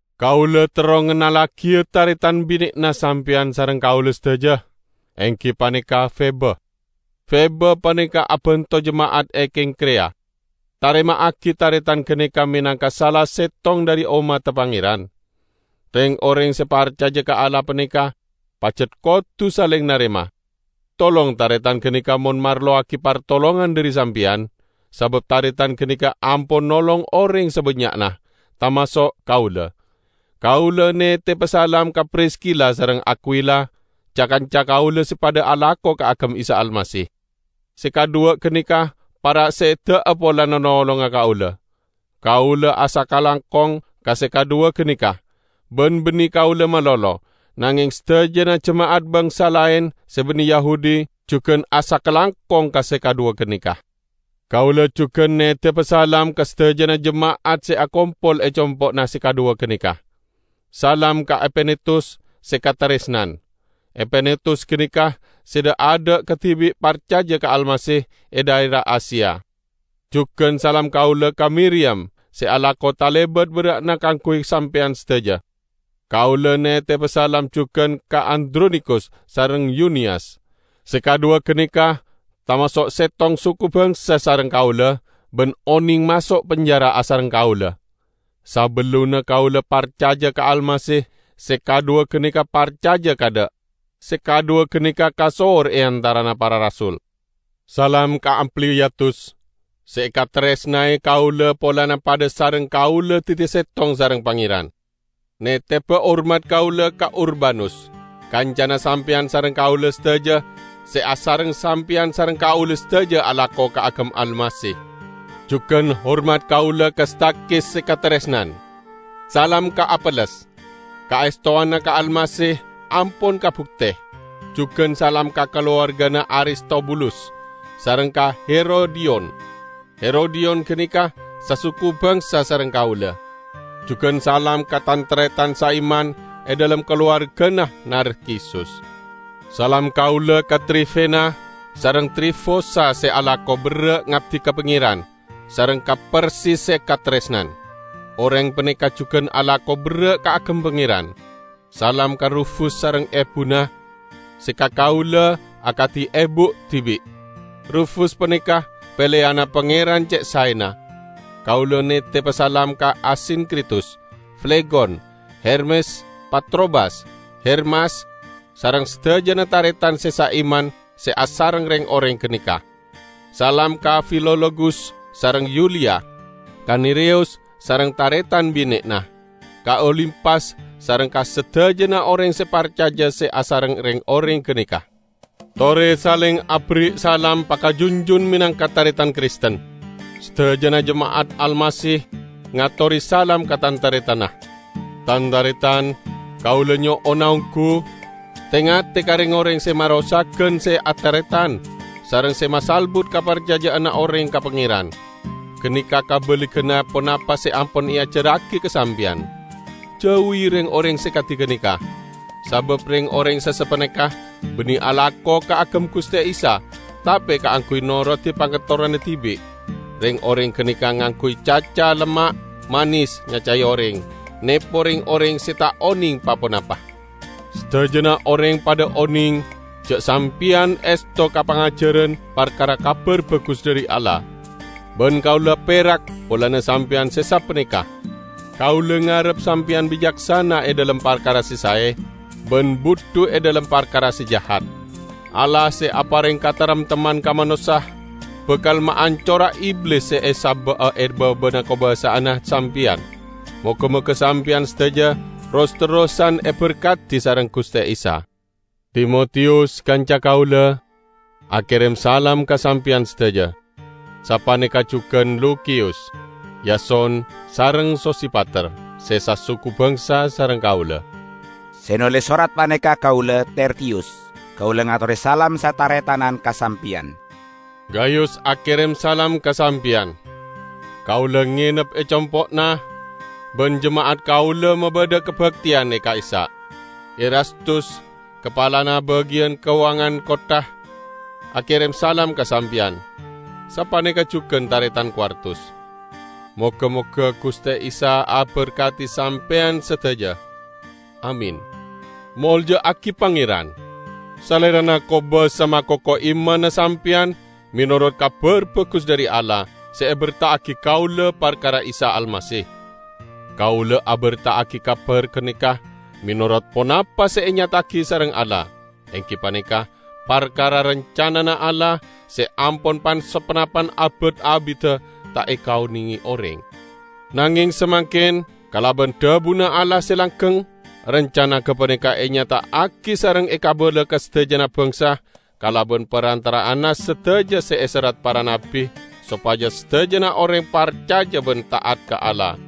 Kaula terro ngennallagiya taretan bine'na sampeyan sareng kaula sadaja, enggi paneka Febe. Febe paneka abanto jema'at e Kengkreya. Tarema'agi taretan ganeka menangka sala settong dhari ommadda Pangeran. Reng-oreng se parcaja ka Allah paneka pajat kodu saleng narema. Tolong taretan ganeka mon marlowagi partolongan dhari sampeyan, sabab taretan ganeka ampon nolong oreng sabannya'na -- tamaso' kaula. Kaula neteba salam ka Priskila sareng Akwila, ca-kanca kaula se padha alako kaagem Isa Almasih. Se kadhuwa ganeka para' seda'a polana nolonga kaula. Kaula asakalangkong ka se kadhuwa ganeka -- ban banne kaula malolo, nangeng sadajana jema'at bangsa laen se banne Yahudi jugan asakalangkong ka se kadhuwa ganeka. Kaula jugan neteba salam ka sadajana jema'at se akompol e compo'na se kadhuwa ganeka. Salam ka Epenetus se kataresnan. Epenetus ganeka se dha'-adha' kadibi' parcaja ka Almasih e dhaera Asia. Jugan salam kaula ka Miriyam, se alako talebat berra'na kaangguy sampeyan sadaja. Kaula neteba salam jugan ka Andronikus sareng Yuniyas. Se kadhuwa ganeka tamaso' settong suku bangsa sareng kaula ban oneng maso' penjara asareng kaula. Sabellunna kaula parcaja ka Almasih, se kadhuwa ganeka parcaja kaadha'. Se kadhuwa ganeka kasohor e antarana para rasul. Salam ka Ampliyatus, se ekataresnae kaula polana padha sareng kaula daddi settong sareng Pangeran. Neteba hormat kaula ka Urbanus, kancana sampeyan sareng kaula sadaja se asareng sampeyan sareng kaula sadaja alako kaagem Almasih. Jugan hormat kaula ka Stakhis se kataresnan. Salam ka Apeles. Kaestowanna ka Almasih ampon kabukte. Jugan salam ka kalowargana Aristobulus, sareng ka Herodiyon. Herodiyon ganeka sasuku bangsa sareng kaula. Jugan salam ka tan-taretan saiman e dhalem kalowargana Narkisus. Salam kaula ka Trifena sareng Trifosa se alako berra' ngabdi ka Pangeran, sareng ka Persis se kataresnan. Oreng paneka jugan alako berra' kaagem Pangeran. Salam ka Rufus sareng ebuna, se ka kaula akadi ebu dibi'. Rufus paneka peleyanna Pangeran ce' saena. Kaula neteba salam ka Asinkritus, Flegon, Hermes, Patrobas, Hermas, sareng sadajana taretan se saiman se asareng reng-oreng ganeka. Salam ka Filologus sareng Yuliya; ka Nereyus sareng taretan bine'na; ka Olimpas sareng ka sadajana oreng se parcaja se asareng reng-oreng ganeka. Tore saleng aberri' salam pakajunjun menangka taretan Kristen. Sadajana jema'at Almasih ngatore salam ka tan-taretanna. Tan-taretan! Kaula nyo'ona onggu: te-ngate ka reng-oreng se marosagan se ataretan sareng se masalbut kaparcaja'anna oreng ka Pangeran. Ganeka kabaliganna ponapa se ampon eajarragi ka sampeyan. Jauwi reng-oreng se kadi ganeka. Sabab reng-oreng se sapaneka banne alako kaagem Guste Isa, tape kaangguy norodi pangaterrona dibi'. Reng-oreng ganeka ngangguy caca lemma' manes nyacae oreng, nepo reng-oreng se ta' oneng pa-ponapa. Sadajana oreng padha oneng ja' sampeyan esto ka pangajaran parkara Kabar Bagus dhari Allah. Ban kaula perak polana sampeyan se sapaneka. Kaula ngarep sampeyan bicaksana e dhalem parkara se sae, ban budhu e dhalem parkara se jahat. Allah se apareng kataremtemman ka manossa, bakal maancora Iblis se esaba'a e baba'anna kakobasa'anna sampeyan. Moga-moga sampeyan sadaja ros-terrosan eberkadi sareng Guste Isa! Timotiyus, kanca kaula, akerem salam ka sampeyan sadaja. Sapaneka jugan Lukiyus, Yason sareng Sosipater, se sasuku bangsa sareng kaula. Se noles sorat paneka kaula, Tertiyus. Kaula ngatore salam sataretanan ka sampeyan. Gayus akerem salam ka sampeyan. Kaula ngenep e compo'na, ban jema'at kaula mabadha kabakteyan e ka'issa'. Erastus, kapalana bagiyan kauwangan kottha, akerem salam ka sampeyan. Sapaneka jugan taretan Kwartus. ( Moga-moga Guste Isa aberkadi sampeyan sadaja. Amin.) Molja'agi Pangeran! Salerana kobasa makoko imanna Sampeyan menorot Kabar Bagus dhari Allah se eberta'agi kaula parkara Isa Almasih. Kaula aberta'agi kabar ganeka menorot ponapa se enyata'agi sareng Allah; enggi paneka parkara rancanana Allah se ampon pan-saponapan abad abidda ta' ekaonenge oreng. Nangeng samangken kalaban dhabuna Allah se langgeng, rancana gapaneka enyata'agi sareng ekabala ka sadajana bangsa kalaban parantara'anna sadaja se eserrat para nabbi, sopaja sadajana oreng parcaja ban ta'at ka Allah.